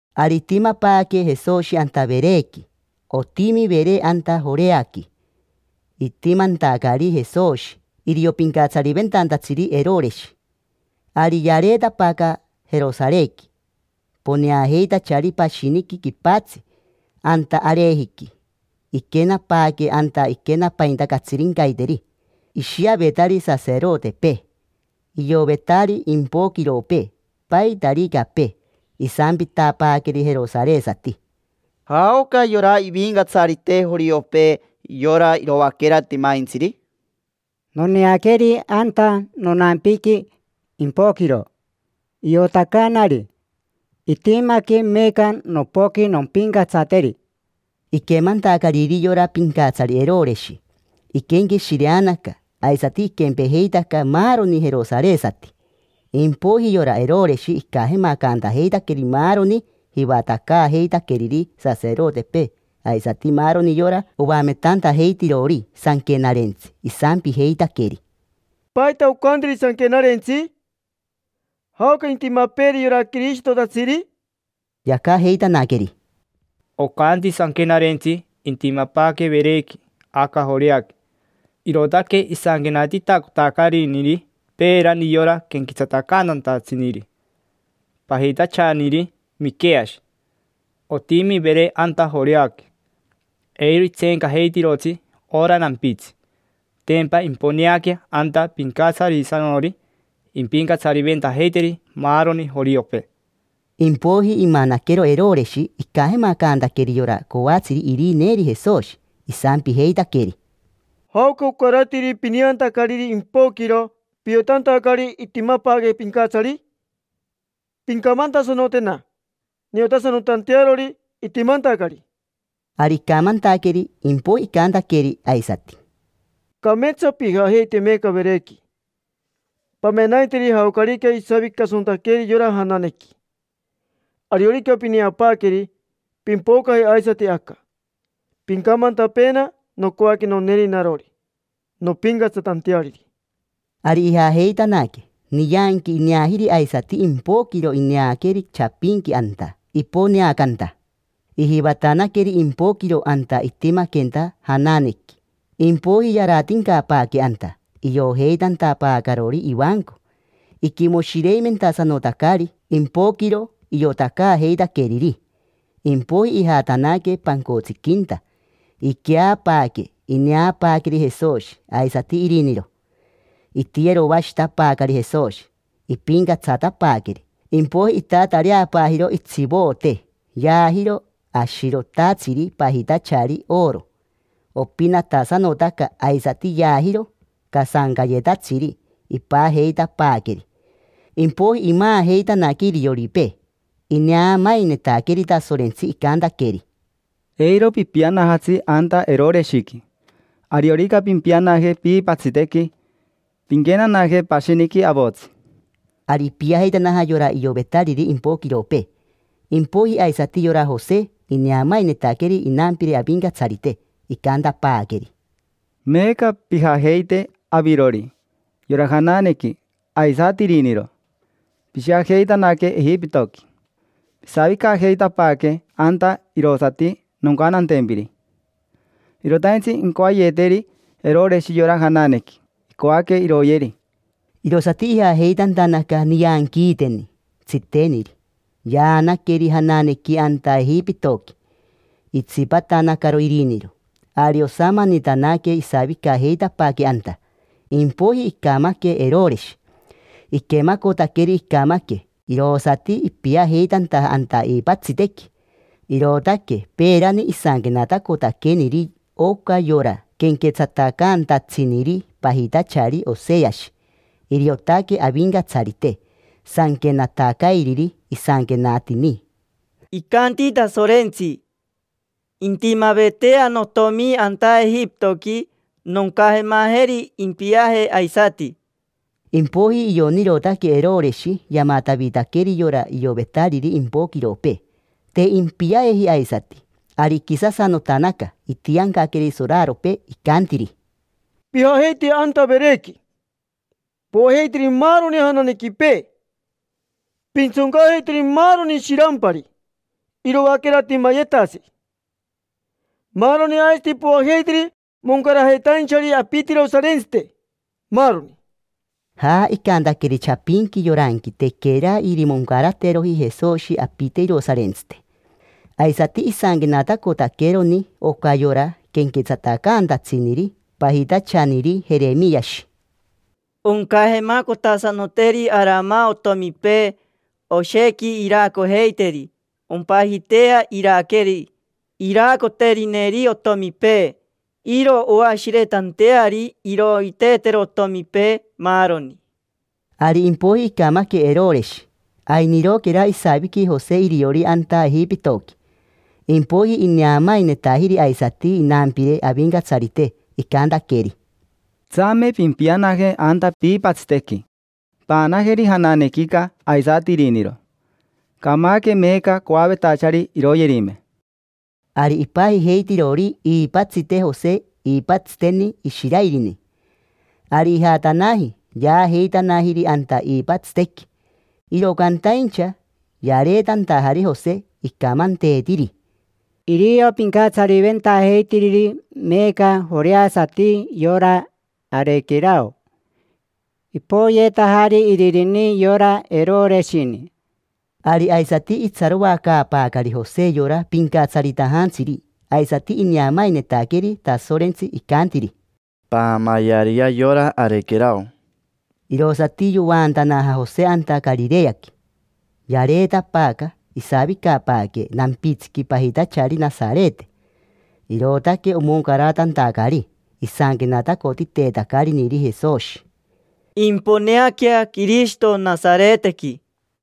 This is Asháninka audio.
Ari itimapaaque Jesoshi anta Verequi. Otimi Vere anta Joreaqui. Itimantacari Jesoshi, irio pincatsariventantatsiri Eroreshi. Ari yareetapaaca Jerosarequi poneajeitachari pashiniqui quipatsi, anta arejiqui. Iquenapaaque anta iquenapainta catsirincaiteri. Ishiavetari saserotepee, ioyevetari impoquiropee, paitaricapee. Isampitapaaqueri jerosaresati: —¿Jaoca yora ivincatsarite joriopee, yora iroaquera timaintsiri? Noneaqueri anta nonampiqui impoquiro iotacaanari itimaque. Meeca nopoqui nompincatsateri. Iquemantacariri yora pincatsari Eroreshi, iquenqueshireanaca, aisati iquempejeitaca maaroni jerosaresati. Impoiji yora Eroreshi icajemacantajeitaqueri maaroni jivatacaajeitaqueriri saserotepee aisati maaroni yora oametantajeitirori sanquenarentsi. Isampijeitaqueri: —¿Paita ocantiri Sanquenarentsi? ¿Jaoca intimapeeri yora Quirishitotatsiri? Yacajeitanaqueri: —Ocanti Sanquenarentsi intimapaaque Verequi, aca Joreaqui. Irootaque isanquenatacotitacariniri peerani yora quenquetsatacantantatsiniri pajitachaniri Miqueashi: “Otimi Vere anta Joreaqui. Eiro itseencajeitirotsi ora nampitsi. Tempa imponeaquea anta Pincatsarisanori. Impincatsariventajeiteri maaroni joriopee”. Impoiji imanaquero Eroreshi icajemacantaqueri yora coatsiri irineeri Jesoshi. Isampijeitaqueri: —¿Jaoca ocaratiri pineantacariri impoquiro piotantacari itimapaaque pincatsari? Pincamantasanotena niotasanotantearori itimantacari. Ari icamantaqueri. Impoiji icantaqueri aisati: —Cameetsa pijajeite meeca Verequi, pamenaiteri jaocarica isavicasanotaqueri yora jananequi. Ariorica pineapaaqueri, pimpocaje aisati aca, pincamantapeena. Nocoaque noneeri narori, nompincatsatanteariri. Ari ijajeitanaque. Nianqui ineajiri aisati impoquiro ineaqueri chapinqui anta iponeacanta. Ijivatanaqueri impoquiro anta itimaquenta jananequi, impoiji yaratincapaaque anta, iojeitantapaacarori ivanco. Iquimoshireimentasanotacari impoquiro iotacaajeitaqueriri. Impoiji ijatanaque pancotsiquinta, iqueapaaque. Ineapaaqueri Jesoshi, aisati iriniro. Itiyeroashitapaacari Jesoshi, ipincatsatapaaqueri. Impoiji itatareapaajiro itsivoote, yaajiro ashirotatsiri pajitachari oro. Opinatasanotaca. Aisati yaajiro casancayetatsiri, ipajeitapaaqueri. Impoiji imaajeitanaque irioripee. Ineamainetaqueri Tasorentsi, icantaqueri: —Eiro pipianajatsi anta Eroreshiqui; ariorica pimpianaje piipatsitequi, pinquenanaje pashiniqui avotsi. Ari ipiajeitanaja yora iovetariri impoquiropee. Impoiji aisati yora Jose ineamainetaqueri inampire Avincatsarite. Icantapaaqueri: —Meeca pijajeite: avirori, yora jananequi, aisati iriniro. Pishiajeitanaque Ejipitoqui. Pisavicajeitapaaque anta irosati noncantantempiri. Irotaintsi incoayeteri Eroreshi yora jananequi. Icoaque iroyeri. Irosati ijajeitantanaca, nianquiiteni tsiteniri. Yaanaqueri jananequi anta Ejipitoqui, itsipatanacaro iriniro. Ari osamanitanaque isavicajeitapaaque anta. Impoiji icamaque Eroreshi. Iquemacotaqueri icamaque, irosati ipiajeitantaja anta iipatsitequi. Irootaque peerani isanquenatacotaqueniri oca yora quenquetsatacaantatsiniri pajitachari Oseashi. Iriotaque Avincatsarite sanquenatacairiri. Isanquenatini: “Icanti Tasorentsi: ‘Intimavetea notomi anta Ejipitoqui, noncajemajeri impiaje aisati’”. Impoiji ionirotanaque Eroreshi yamatavitaqueri yora iovetariri impoquiropee: te impiajeji aisati. Ari iquisasanotanaca, itiancaqueri soraropee, icantiri: —Pijajeite anta Verequi, poajeiteri maaroni jananequipee, pintsoncajeiteri maaroni shirampari: iroaquera timayetatsiri, maaroni; aisati poajeiteri moncaratainchari apite irosarintsite, maaroni. Ja, icantaqueri chapinqui yoranqui tequera irimoncarateroji Jesoshi apite irosarintsite. Aisati isanquenatacotaqueroni oca yora quenquetsatacaantatsiniri pajitachaniri Jeremiashi: “Oncajemacotasanoteri aramasato otomipee, oshequi iraacojeiteri. Ompajitea Araquere iraacoterineri otomipee. Iro oashiretanteari iroiteetero otomipee, maaroni”. Ari impoiji icamaque Eroreshi, ainiroquera isaviqui Jose iriori anta Ejipitoqui. Impoiji ineamainetajiri aisati inampire Avincatsarite, icantaqueri: —Tsame pimpianaje anta piipatsitequi, paanajeri jananequica aisati iriniro. Camaque meeca coavetachari iroyerime. Ari ipajijeitirori iipatsite Jose iipatsiteni Ishiraerini. Ari ijatanaji, yaajeitanajiri anta iipatsitequi. Iro cantaincha yareetantajari Jose, icamanteetiri: —Irio pincatsariventajeitiriri meeca joreasati yora Arequerao. Ipoyeetajari iririni: yora Eroreshini. Ari aisati itsaroacaapaacari Jose yora pincatsaritajantsiri, aisati ineamainetaqueri Tasorentsi, icantiri: —Paamayeariyea yora Arequerao. Irosati yovaantanaja Jose anta Carireaqui. Yareetapaaca, isavicapaaque nampitsiqui pajitachari Nasarete. Irootaque omoncaratantacari isanquenatacotiteetacariniri Jesoshi: “Imponeaquea Quirishito Nasaretequi”.